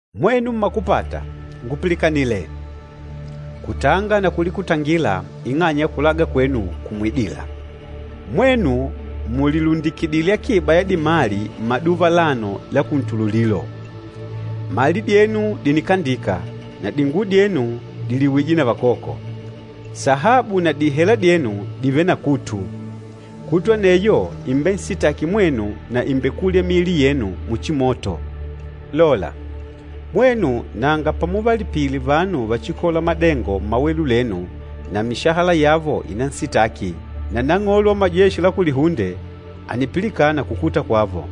Mwenu mmakupata, ngupilikanile! Kutanga na kulikutangila ing'anya ya kulaga kwenu kumwidîla. Mwenu mùlilundikidile akiba ya dimali mmaduva alano la kuntululilo! Mali dyenu dìnikandika, na dinguwo dyenu dìliwije na vakoko. Sahabu na dihela dyenu dìvele na kutu. Kutu aneyo ìmbensitaki mwenu na ìmbekulya miili yenu muchi moto. Lola, mwenu nanga pamuvalipile vanu vachikôla madengo mmawelu lenu na mishahala yavo ìnansitaki. Na Nang'olo wa Majeshi la Kulihunde ànipilikana kukuta kwavo.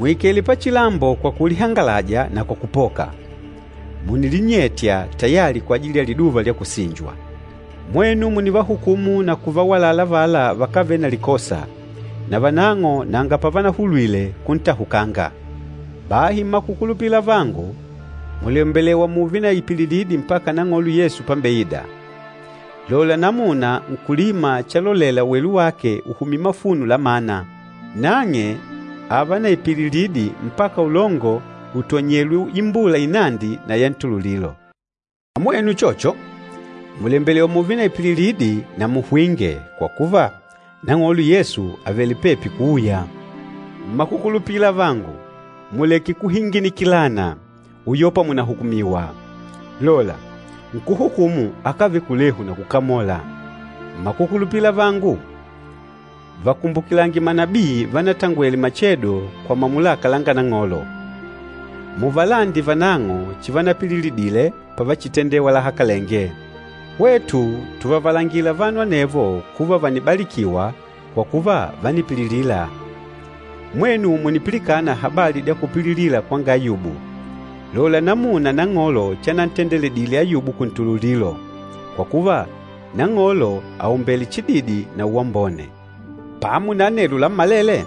Mùikele pachilambo kwa kulihangalaja, na kwa kupoka. Mùnilinyetya tayali kwajili ya liduva lya kusinjwa. Mwenu mùnivahukumu na kuvawalala avala vakávele na likosa, navanang'o nanga pavanahulwile kuntahukanga! Bahi mmakukulupila avangu, mùlembelewa mùùve na ipililidi mpaka Nang'olo Yesu pambeida. Lola namuna nkúlima chalolela welu wake uhumye mafuno la mana. Nang'e ààva na ipililidi mpaka ulongo utonyelwe imbula inandi na ya ntululilo. Na mwenu uchocho, mùlembelewa mùùve na ipililidi na muhwinge, kwa kuva, Nang'olo Yesu àvele pepi kuuya. Mmakukulupila avangu, muleke kuhinginikilana, uyopa mùnahukumiwa. Lola, nkúhukumu akávele kulehu na kukamola. Mmakukulupila avangu, vakumbukilange manabii vanatangwele machedo kwa mamulaka langa Nang'olo. Muvalande vanang'o chivanapililidile pavachitendewa lahakalenge. Hwetu tùvavalangila vanu anevo kuva vànibalikiwa, kwa kuva vánipililila. Mwenu mùnipilikana habali dya kupililila kwanga Ayubu, lola namuna Nang'olo chanantendedile Ayubu kuntululilo. Kwa kuva, Nang'olo àumbele chididi na uwambone. Pamo na anelo lammalele,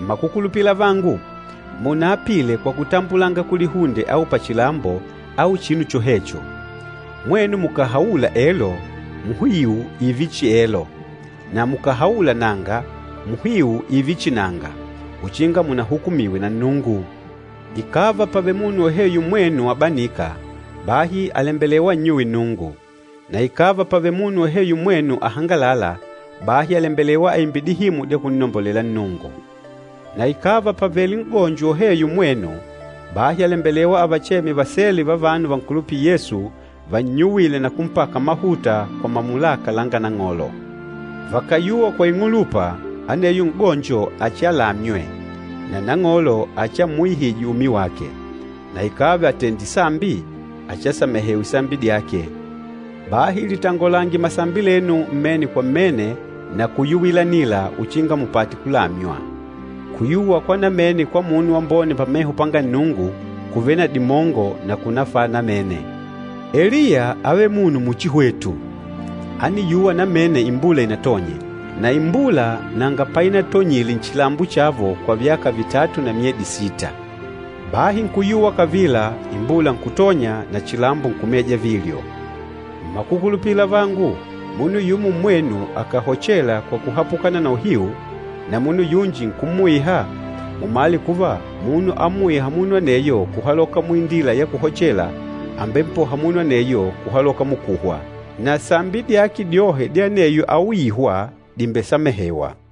mmakukulupila avangu, munaapile kwa kutambulanga kulihunde au pachilambo au chinu chohecho. Mwenu mukàhaula “Elo,” muhiu ììve chihi elo, na mukàhaula “Nanga,” muhiu ììve chihi nanga, uchinga munahukumiwe na Nnungu. Ikàva pàvele munu woheyo mmwenu abanîka, bahi àlembelewa annyuwe Nnungu. Na ikàva pàvele munu woheyo mmwenu ahangalâla, bahi àlembelewa aimbe dihimu dya kunnombolela Nnungu. Na ikàva pàvele n'gonjo woheyo mmwenu, bahi àlembelewa avacheme vasele va vanu vankulupîla Yesu vannyuwile na kumpaka mahuta kwa mamulaka langa Nang'olo. Vakàyuwa kwa ing'ulupa, aneyo n'gonjo achialamywe, na Nang'olo achiammuihije umi wake. Na ikàva àtendile sambi, achiasamehewe sambi dyake. Bahi litangolange masambi lenu mmene kwa mmene na kuyuwilanila uchinga mupate kulamywa. Kuyuwa kwa namene kwa munu wambone pameho panga Nnungu kùvele na dimongo na kùnafala namene. Eliya ávele munu muchi hwetu. Ániyuwa namene imbula inatonye, na imbula nanga painatonyile nchilambo chavo kwa vyaka vitatu na myedi sita. Bahi nkuyuwa kavila, imbula nkutonya, na chilambo nkumeja vilyo. Mmakukulupila avangu, munu yumo mmwenu akàhochela kwa kuhapukana na uhiu, na munu yunji nkummuiha, mumale kuva, munu ammuîha munu aneyo kuhaloka muindila ya kuhochela, àmbempoha munu aneyo kuhaloka mukuhwa, na sambi dyake dyohe dya aneyo auîhwa dìmbesamehewa.